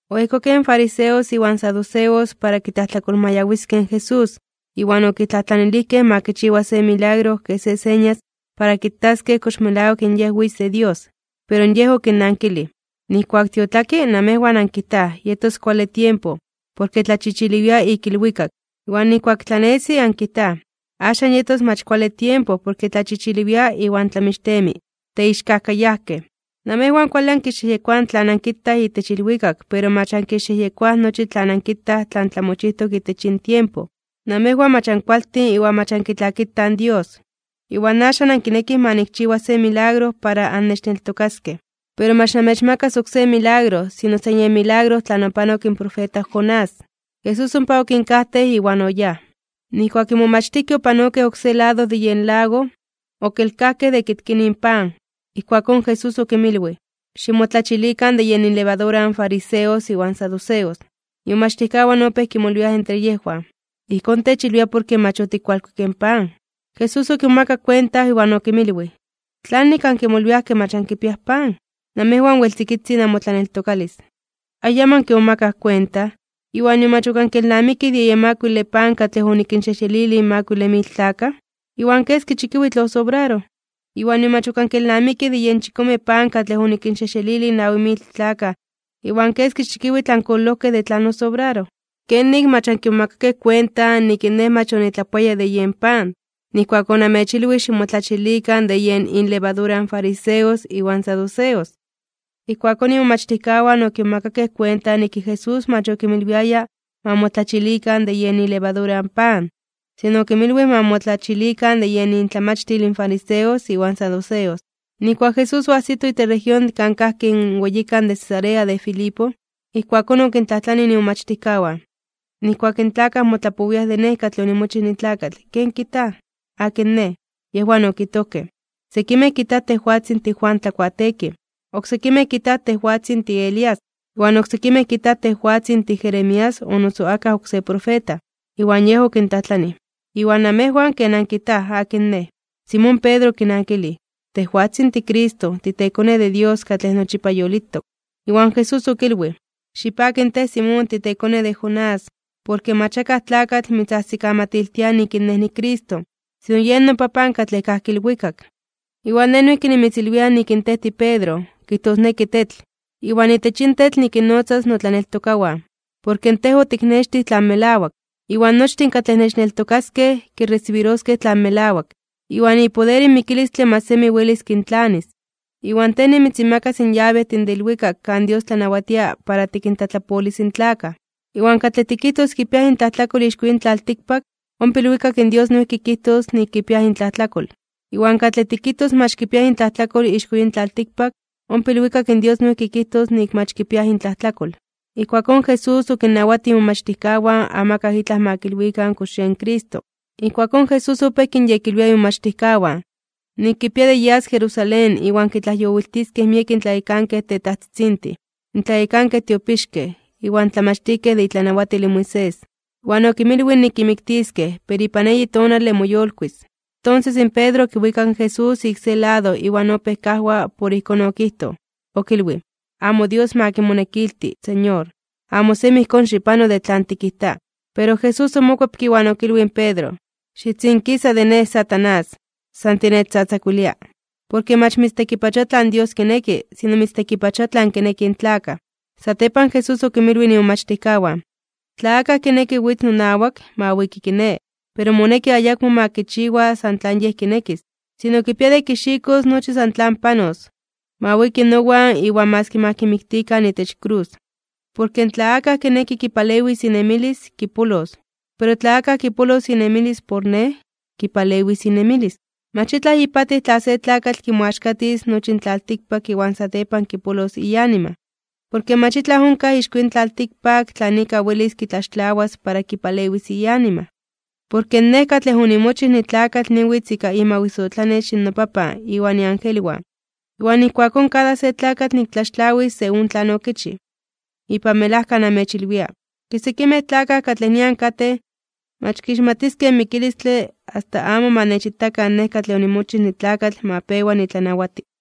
Oejkokej in fariseos iwan saduceos para kitlajtlakolmayawiskej in Jesús, iwan okitlajtlanilijkej ma kichiwa se milagro kej se señas para kitaskej kox melawak in Yej witz de Dios. Pero Yej okinnankilij: ―Nijkuak tiotlaki, namejwan ankijtaj: “Yetos kuale tiempo, porke tlachichiliwia ik ilwikak.” Iwan nijkuak tlanesi ankijtaj: “Axan yetos mach kuale tiempo porke tlachichiliwia iwan tlamixtemi.” ¡Teixkajkayajkej! Namejwan kuale ankixyejyekoaj tlan ankitaj itech ilwikak pero mach ankixyejyekoaj nochi tlan ankitaj tlan tlamochijtok itech yin tiempo. Namejwan mach ankualtin iwan mach ankitlakitaj in Dios. Iwan axan ankinekij ma nikchiwa se milagro para annechneltokaskej. Pero mach namechmakas oksé milagro, sino san yen milagro tlan opanok in profeta Jonás. Jesús ompa okinkajtej iwan oyáj. Nijkuak in momachtijkej opanokej oksé lado de yen lago, okelkajkej de kitkinij in pan. Ijkuakón Jesús okinmilwij: ―Ximotlachilikan de yen inlevadura in fariseos iwan saduceos. Imomachtijkawan opéj kimolwiaj entre yejwan: ―Ijkón techilwia porke mach otikualkuikej in pan. Jesús okimomakak kuenta, iwan okinmilwij: ―¿Tlanik ankimolwiaj ke mach ankipiaj pan? Namejwan wel tzikitzin namotlaneltokalis. ¿Ayamo ankimomakaj kuenta, iwan nion mach ok ankelnamikij de yen makuile pan katlej onikinxejxelilij in makuile mil tlakaj, iwan keski chikiwitl osobraroj? ¿Iwan nion mach ok ankelnamikij de yen chikome pan katlej onikinxejxelilij in nawi mil tlakaj, iwan keski chikiwitl ankololojkej de tlan osobraroj? ¿Kenik mach ankimomakakej kuenta nik in Nej mach onitlapoaya de yen pan, nijkuak onamechilwij ximotlachilikan de yen inlevadura in fariseos iwan saduceos? Ijkuakón imomachtijkawan okimomakakej kuenta nik in Jesús mach okinmilwiaya ma motlachilikan de yen ilevadura in pan, sino okinmilwij ma motlachilikan de yen intlamachtil in fariseos iwan saduceos. Nijkuak Jesús oajsito itech región kan kajki in weyikan de Cesarea de Filipo, ijkuakón okintlajtlanij imomachtijkawan: ―Nijkuak in tlakaj motlapowiaj de Nej katlej onimochij nitlakatl, ¿ken kijtaj? ¿Akin Nej? Yejwan okijtojkej: ―Sekimej kijtaj tejwatzin tiJuan Tlakuateekij. Oksekimej kijtaj tejwatzin tiElías, iwan oksekimej kijtaj tejwatzin tiJeremías o noso akaj oksé profeta. Iwan Yej okintlajtlanij: ―Iwan namejwan, ¿ken ankijtaj? ¿Akin Nej? Simón Pedro okinankilij: ―Tejwatzin tiCristo, titeKone de Dios katlej nochipa yolitok. Iwan Jesús okilwij: ―Xipaki tej, Simón, titekone de Jonás, porke mach akaj tlakatl mitzajsikamatiltia nik in Nej niCristo, sino yen noPapan katlej kajki ilwikak. Iwan Nej noijki nimitzilwia nik in tej tiPedro (kijtosneki tetl), iwan itech yin tetl nikinnotzas notlaneltokawan. Porke tej otiknextij tlan melawak. Iwan nochtin katlej nechneltokaskej, kiresibiroskej tlan melawak. Iwan ipoder in mikilistle mach semi welis kintlanis. Iwan tej nimitzinmakas in yabejtin de ilwikak kan Dios tlanawatia para tikintlatlapolis in tlakaj. Iwan katlej tikijtos kipiaj intlajtlakol ixko yin tlaltikpak, ompa ilwikak in Dios noijki kijtos nik kipiaj intlajtlakol. Iwan katlej tikijtos mach kipiaj intlajtlakol ixko yin tlaltikpak, ompa ilwikak in Dios noijki kijtos nik mach kipiaj intlajtlakol. Ijkuakón Jesús okinnawatij imomachtijkawan amakaj itlaj ma kilwikan kox yen Cristo. Ijkuakón Jesús opéj kinyekilwia imomachtijkawan, nik kipia de yas Jerusalén iwan kitlajyowiltiskej miek in tlayekankej tetajtzitzintin, in tlayekankej tiopixkej, iwan in tlamachtijkej de itlanawatil in Moisés. Iwan okinmilwij nik kimiktiskej, pero ipan eyi tonale moyolkuis (moyolitis). Tonses in Pedro okiwikak in Jesús ik se lado iwan opéj kajwa por ijkón okijtoj, okilwij: ―Amo Dios ma kimonekilti, Señor. Amo semi ijkón xipano de tlan tikijta. Pero Jesús omokuepke iwan okilwij in Pedro: ―Xitzinkisa de Nej, Satanás. San tinechtzatzakuilia. Porke mach mitztekipachoa tlan Dios kineki, sino mitztekipachoa tlan kinekij in tlakaj. Satepan Jesús okinmilwij imomachtijkawan: ―Tla akaj kineki witz nonawak, ma wiki kiné, pero moneki ayakmo ma kichiwa san tlan yej kinekis. Sino kipia de kixikos nochi san tlan panos, ma wiki nowan iwan maski ma kimiktikan itech krus. Porke tla akaj kineki kipalewis inemilis, kipolos. Pero tla akaj kipolos inemilis por Nej, kipalewis inemilis. Mach itlaj ipatij tla se tlakatl kimoaxkatis nochi in tlaltikpak iwan satepan kipolos ianima. Porke mach itlaj onkaj ixko yin tlaltikpak tlan ika welis kitlaxtlawas para kipalewis ianima. Porke Nej katlej onimochij nitlakatl niwitz ika imawisotlanex in noPapan iwan iangelwan, iwan ijkuakón kada se tlakatl niktlaxtlawis según tlan okichij. Ipan melajka namechilwia, ke sekimej tlakaj katlej nian katej, mach kixmatiskej in mikilistle asta amo ma nechitakan Nej katlej onimochij nitlakatl ma pewa nitlanawati.